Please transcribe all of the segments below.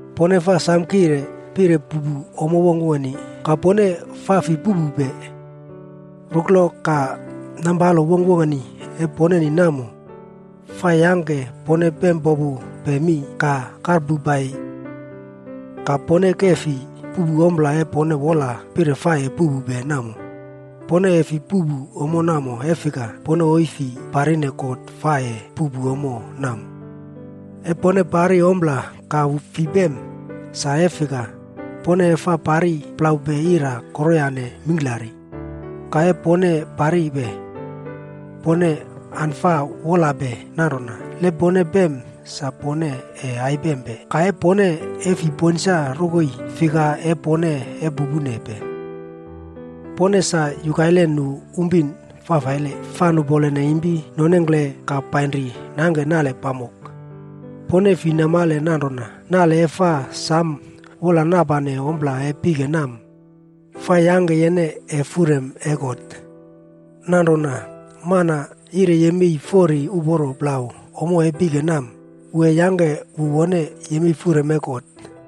Pone fa samo wola pire puꞌpu ommo wongkwongkeni, ka pone fi fa puꞌpupe. Nale e pone fa nampalope ommo wongkwongkeni namo, fa yangke pone popu mi ka karpopupe ka pufro nu uma riline. Ka pone ese fi puꞌpu ommo namo e pone wola pire pone ese puꞌpu. Pone fi fa puꞌpu ommo namo e fika, pone isi fi parine God fa ese puꞌpu ommo namo. E pone fa parine ompla ka pone fi pem, sa nanrona, pone fa parine plau wolpuna fafaile mingklari. Ka e pone parine, pone fa wola nanrona le pone pem sa pone ese saimopane pone ese fi samo ponsa rokoi rongkele sa uporo fa ese pangke. Pone sa yukaine nu pinmana fafaile fa nupole impi nonengkle ka painri nangke nale pamok. Pone fi namale nanrona nale e fa samo wolane ompla e pike mee, fa yangke yene ese waiye iim e God? Nanrona fane le mana yire yemei fori uporo plau ommo e pike mee, wu ese yangke wu wone yemei iim e God.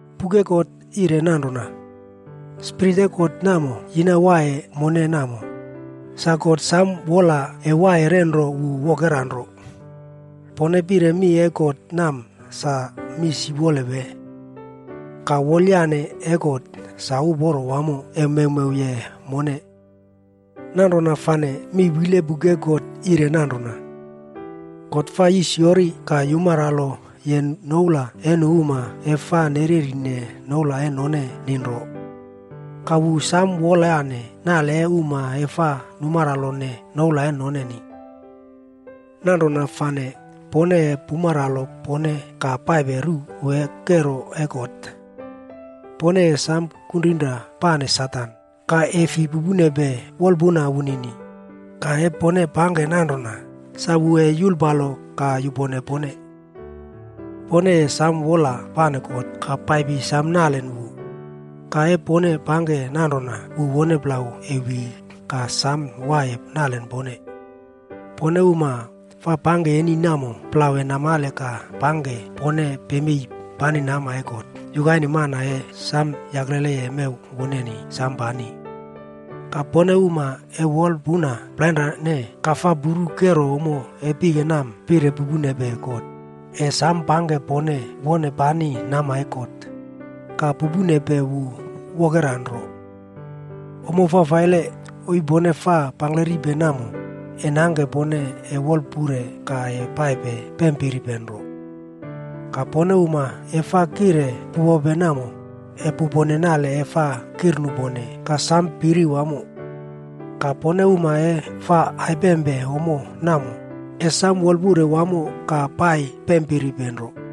Buk e God yire nanrona, “Spirit namo e God yina waiye mone namo, sa God samo wola wu ese waiye ruwe wu wokera nro.” Pone pire mi e God mee sa mi siwole wee? Ka wolyane e God sa uporo wamo ka fa mewmewye mone. Nanrona fane mi wiye buk e God yire nanrona, “God fa yisiyori ka yumanralo noula e nu uma fa nererine noula noneni namo samo panro, ka wu fa samo wolyane nu uma fa numaro noula noneni.” Nanrona fane pone ese pumanralo pone ka paipe ruwe kero e God. Pone ese samo kuma pane Satan ka pupene wolpuna wunini. Le pone pangke nanrona, sa wu ese yulpalo ka yupone pone. Pone ese samo wola pane God ka paipi ekrene wu. Le pone pangke nanrona sa wu wone plau e yolowi ka samo waiye ekrene pone. Pone uma fa pangke nale fafaile namo re ese namale ka pangke pone paipe namkire nama e God yukaine mana e samo yaklele mew woneni samo namkire. Ka pone uma e fa wolpuna plainrane ka fa puru kero pike mee pire pupene God, ese samo pangke pone ese paipe namkire nama e God, ka pupene wu wokera nro. Ommo fafaile pone isi pangke namo, ese yangke pone wolpaure ka piripe nro ka paipe. Ka pone uma e samo wolapeni fa pupope namo, ese pupone nale e fa nupone ka pone ese samo piri wamo. Ka pone uma fa aipempe ommo namo, ese samo wolpaure wamo ka piripe nro ka paipe.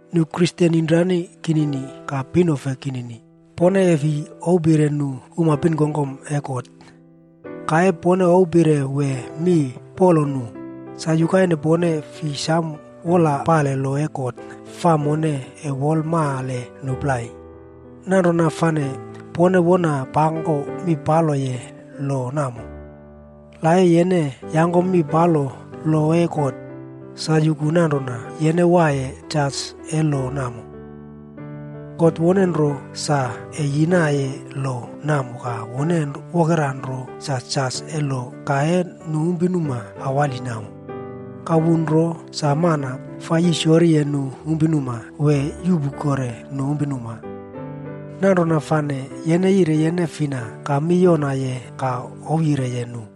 Nu Kristen inomranimpi ka pinefe kinini, pone e fi ouwpire nu pinuma e God. Ka le pone ouwpire wee paku mi palo nu, sa yukaine pone fi samo wolpane lo e God yire mone samo wolmane nu plai, nanrona fane pone wona paku mi paloye lo namo. Ka le yene yaku mi palo lo e God, sa yuku nanrona yene waiye jas e lo namo. God nro isi yangke lo namo ka wu wokera nro sa waiye jas e lo namo ka pinuma mingklari. Wu nro sa mana fa yisiyoriye nu pinuma wee yuꞌpu kore nu pinuma. Nanrona fane yene yire yene fina ka yangkom mi palo nu plai ka ouwyireye nu?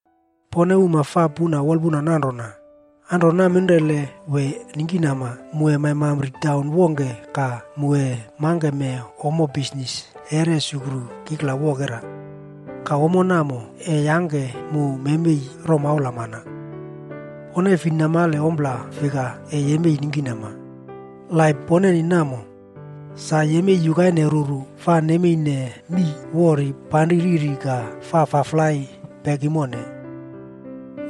Pone uma e fa puna wolpuna nanrona, “Anro naminrele wee ningkinama mu ese maimpi taun wongke ka mu ese mangke ommo bisnis ese resukru kikla wokera. Ka ommo namo ese yangke mu memei romaula mana.” Pone fi namale ompla fika ese yemei ningkinama. Laip poneni namo, sa yemei yukaine ruru fa yemeiye mii wori ka pari riri ka fa wampane palo.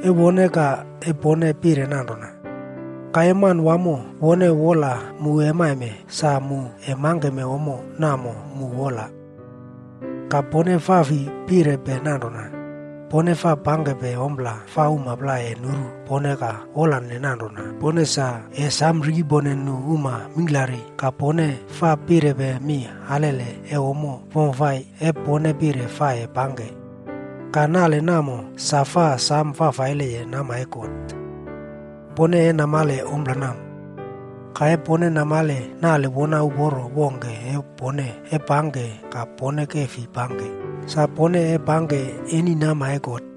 Ese uporo wamo pone ese pire nanrona, “Ka le Manawamo wone wolyire mu ese maime, sa mu ese mangke ommo namo e mu wolame.” Ka pone fi fa pire nanrona, pone fa pangke ompla ese nu plai nuru pone ka wola nanrona pone samo rikepone uma mingklari ka pone pire mi alele ommo wamfafai pone pire pangke. Ka nale namo sa fafaile nama e God. Pone ese namale ompla namo. Ka le pone namale nale uporo wongke e pone ese pangke ka pone fi pangke, sa pone pangke nale fafaile nama e God.